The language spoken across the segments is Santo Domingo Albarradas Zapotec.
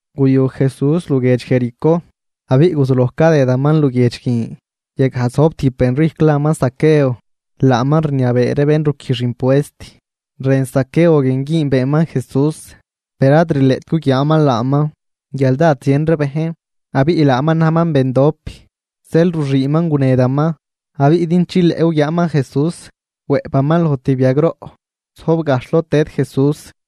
Guyu Jesús luguiedx Jericó abiꞌ guzuloj cadëdaman luguiedx guin. Yagaj zojb tijb benrijcw laman Zaqueo. Laaman rniabee ree bén ruquijx impuest. Rën Zaqueo guin güünbeeman Jesús, per ad rileꞌt guguiaaman laaman guial dád zien ree bejn abiꞌ laaman najman bendop. Zeel ruxüünman gunedaman, abiꞌ din chileꞌ guguiaaman Jesús, wëꞌpaman loj tijb yagroꞌ zojb gajxh lod tëd Jesús.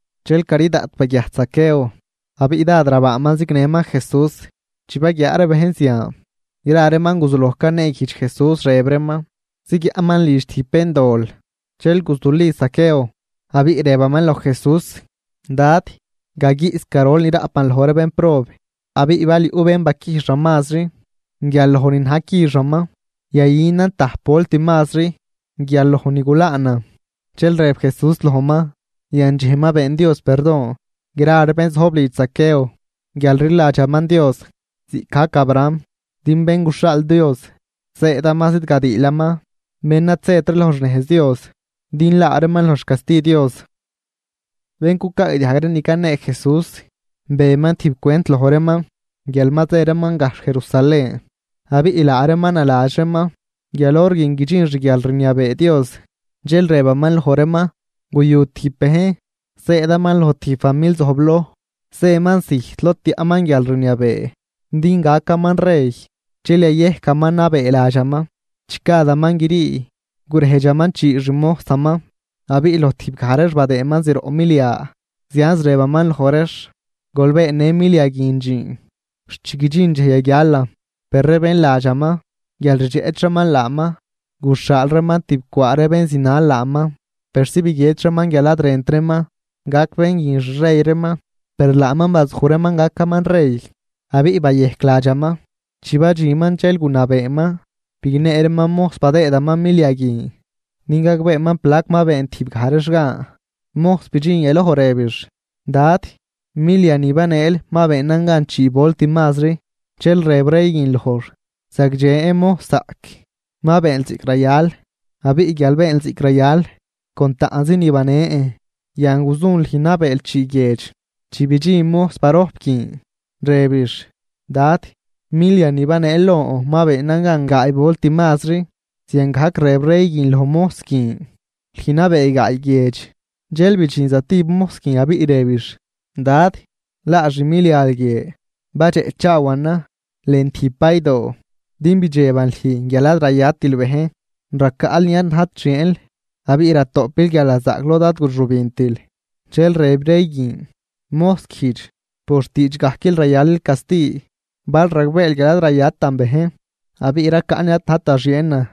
Dxel cari daꞌt baguiajt Zaqueo, abiꞌ dád rabaaman zignëman Jesús. Chi baguiaa ree bejn zian, gra reeman guzuloj caneeguijdx Jesús rëb reeman zigyaꞌnman lidx tijb béndol. Dxel guzuli Zaqueo, abiꞌ rëbaman loj Jesús: ―Dad, gaguiꞌs garol ni raꞌpan loj ree bénprob. Abiꞌ bal yuꞌ bén baquijxan mazri guial loj ni na̱j quixaman, yayünan tajp volt mazri guial loj ni gulaanan. Dxel rëb Jesús lojman: ―Yandxej ma been Dios perdon gra ree bén zojb lidx Zaqueo guial rliladxaman Dios ziꞌcgajc Abraham. Din Bén guxhaal Dios zëëdaman zidgadiilaman bén ad zët ree loj xnejz Dios din laa reeman loj xcasti Dios. Bén cucaagdiajg ree ni canee Jesús, beman tijb cwent loj reeman guial ma zë reeman gajxh Jerusalén abiꞌ laa reeman naladx reeman guial hor guin guidxin xguialrniabee Dios. Dxel rëbaman loj reeman: ―Guyu tijb bejn, zëëdaman loj tijb famil zojbloj. Zëman zijt lod tiaꞌman guialrniabee din gacaman rey dxel yayejcaman nabee ladxaman. Chi gadaman grii gurejdxaman chii xmojsaman abiꞌ loj tijbgaj reex badëëman zroꞌ milia, zianz rëbaman loj reex: “Gol beennë milia guin dxiin xt chi guidxin dxej yaguialan.” Per ree bén ladxaman guial rdxeꞌch reeman laaman, guxhaal reeman tibcwaa ree bén zinal laaman persi biguiedx reeman guial ad rënt reeman gac bén guin xrey reeman. Per laaman bazuj reeman gacaman rey, abiꞌ bayejc ladxaman. Chi badxinman dxel gunabeeman bignee reeman mojs badëëman milia guin din gagbeeman plac ma been tijbgaj reex gan. Mojs bidxin yaloj rëbix: “Dad, milia ni baneel ma beenan gan chii volt mazri.” Dxel rëb rey guin lojx: “Zagdxen mojszaꞌc, ma beenl ziꞌc rayal. Abiꞌ guial beenl ziꞌc rayal con taꞌnzi ni banen, yan guzun lüj nabeel chii guiedx.” Chi bidxin mojs barojp guin, rëbix: “Dad, milia ni baneel lon ma beenan gan gaay volt mazri.” Ziangajc rëb rey guin loj mojs guin: “Lüj nabee gaay guiedx.” Dxel bidxin zatijb mojs guin abiꞌ rëbix: “Dad, laa xmilial guie, badxeꞌchaawanan lën tijb baydoo, din bidxeban lüj guial ad rayatil bejn. Racaꞌl ni ad najt xieenl abiꞌ ratoꞌpil guialnazaꞌc lod ad guxübintil.” Dxel rëb rey guin: “Mojs guijdx por xtiidxgajquil rayalil casti. Bal ragbeel guial ad rayatan bejn, abiꞌ racaꞌn ni ad najt da xieenan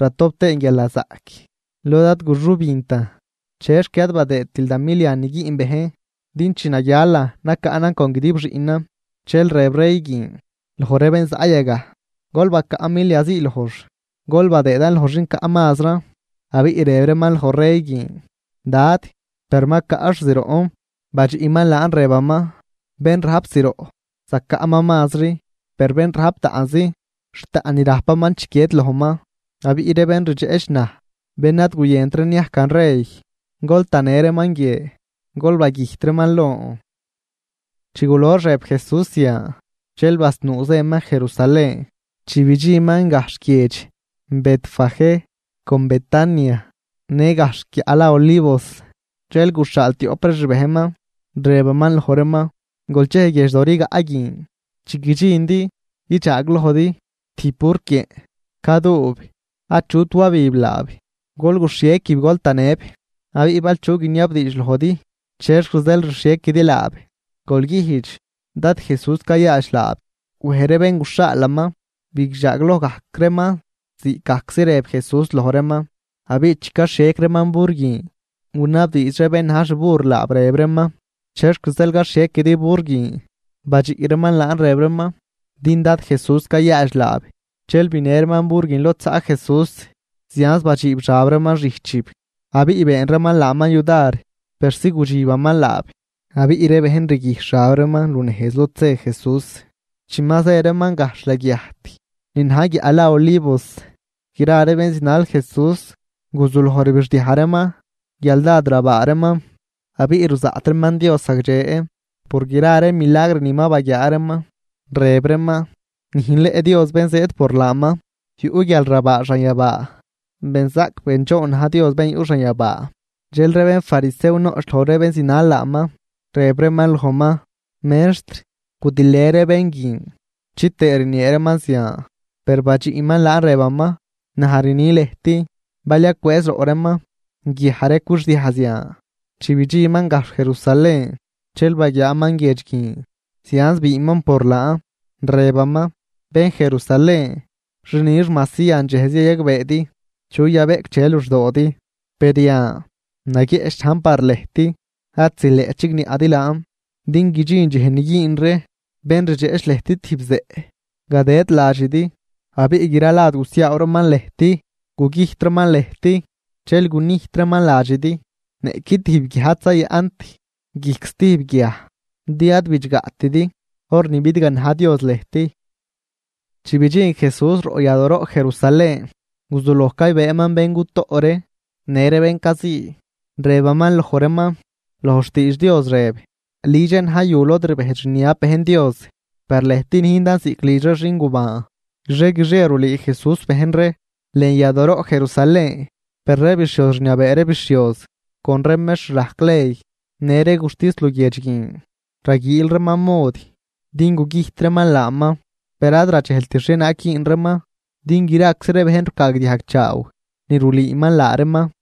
ratop tëën guialnazaꞌc lod ad guxübintan. ¿Chexc ad badëëtil da milian niguiꞌn bejn din chi naguialan nacaꞌnan con guidib xiꞌnan?” Dxel rëb rey guin loj ree bén zaꞌ yagaj: “Gol bacaꞌ milia zii lojx, gol badëëdan loj xin caꞌ mazran.” Abiꞌ rëb reeman loj rey guin: “Dad, per ma caꞌx zroꞌn.” Badxiꞌman laan rëbaman: “Bén rajp zroꞌ, zacaꞌman mazri, per bén rajp taꞌnzi, xt taꞌn ni rajpaman chiquied lojman. Abiꞌ ree bén rdxeꞌch naj bén ad guyënt ree niajcan rey, gol tanë reeman guie, gol bagüjt reeman lon.” Chi gulox rëb Jesús zian, dxel basnuu zëman Jerusalén. Chi bidxinman gajxh guiedx Betfagé con Betania, në gajxh guiaꞌ la Olivos, dxel guxhaal tioꞌp ree xbejnman, rëbaman loj reeman: ―Gol chej guiedxdo rigaꞌ guin, chi guidxindi guidxaaglojdi tijb burquieꞌn, caduub, achut wabib laab. Gol guxhiequib gol tanëb. Abiꞌ bal chu guiniabdiidx lojdi chexc zeel rxhiequidi laab, gol güjdx Dad Jesús cayaadx laab. Wej ree bén guxhaalaman bidxaagloj gajc reeman ziꞌcgajczi rëb Jesús loj reeman. Abiꞌ chi caxhiec reeman bur guin, gunabdiidx ree bén na̱j xbur laab, rëb reeman: ―¿Chexc zeel caxhiequidi bur guin? Badxiꞌ reeman laan, rëb reeman: ―Din Dad Jesús cayaadx laab. Dxel binë reeman bur guin lod zaꞌ Jesús, zianz badxiib xab reeman xijchib abiꞌ been reeman laaman yudar persi gudxibaman laab. Abiꞌ ree bejn rguijxh xab reeman lunejz lod zë Jesús. Chi ma zë reeman gajxh laguiajt ni na̱j guiaꞌ la Olivos, gra ree bén zinal Jesús guzuloj rbixdiaj reeman guial dád rabaa reeman abiꞌ ruzaꞌt reeman Dios zagdxe por gra ree milagr ni ma baguiaa reeman. Rëb reeman: ―¡Nüjnleꞌ Dios bén zëëd por laaman! ¡Yuꞌ guialrabaa xanyabaa! ¡Benzaꞌc bendxoon na̱j Dios bén yuꞌ xanyabaa! Dxel ree bénfarisew noꞌch loj ree bén zinal laaman, rëb reeman lojman: ―Mextr, gudilë ree bén guin chitëë rniee reeman zian. Per badxiꞌman laan rëbaman: ―Naj rni lëjt, bal yacwëëz roꞌ reeman, guiaj ree cwixdiaj zian. Chi bidxinman gajxh Jerusalén, dxel baguiaaman guiedx guin, zianz biinman por laan. Rëbaman: ―¡Bén Jerusalén, xi nix majsi yandxejzi yayagbeedi chu yabeꞌcdxe luxdoodi! Per yan naguieꞌch najn par lëjt, ad zileꞌt chigniaꞌdi laan. Din guidxin dxej ni güün ree bén rdxeꞌch lëjt tijb zeꞌ gadëd ladxidi, abiꞌ gra lad gusiaaw reeman lëjt, gugüjt reeman lëjt. Dxel gunijt reeman ladxidi, niꞌqui tijb guiaj ad zayaꞌnt guijc stijb guiaj, din ad bidxgaꞌtidi hor ni bidganaj Dios lëjt. Chi bidxin Jesús roꞌ yadooroꞌ Jerusalén, guzuloj caybëëman bén cutoꞌ ree në ree bén cazii, rëbaman loj reeman: ―Loj xtiidx Dios rëb: “Lidxan na̱j yu lod rbejdx rniab bejn Dios.” Per lëjt nüjndan ziꞌc lidx ree xingubaan. Guixie guixie rulüü Jesús bejn ree lën yadooroꞌ Jerusalén, per ree bixhioz rniabee ree bixhioz con ree mextr rajc ley, në ree guxtis luguiedx guin raguiil reeman mod din gugüjt reeman laaman. Per ad radxejlt xhienaag güün reeman, din graczi ree bejn rucaagdiajg chaaw ni rulüüman laa reeman.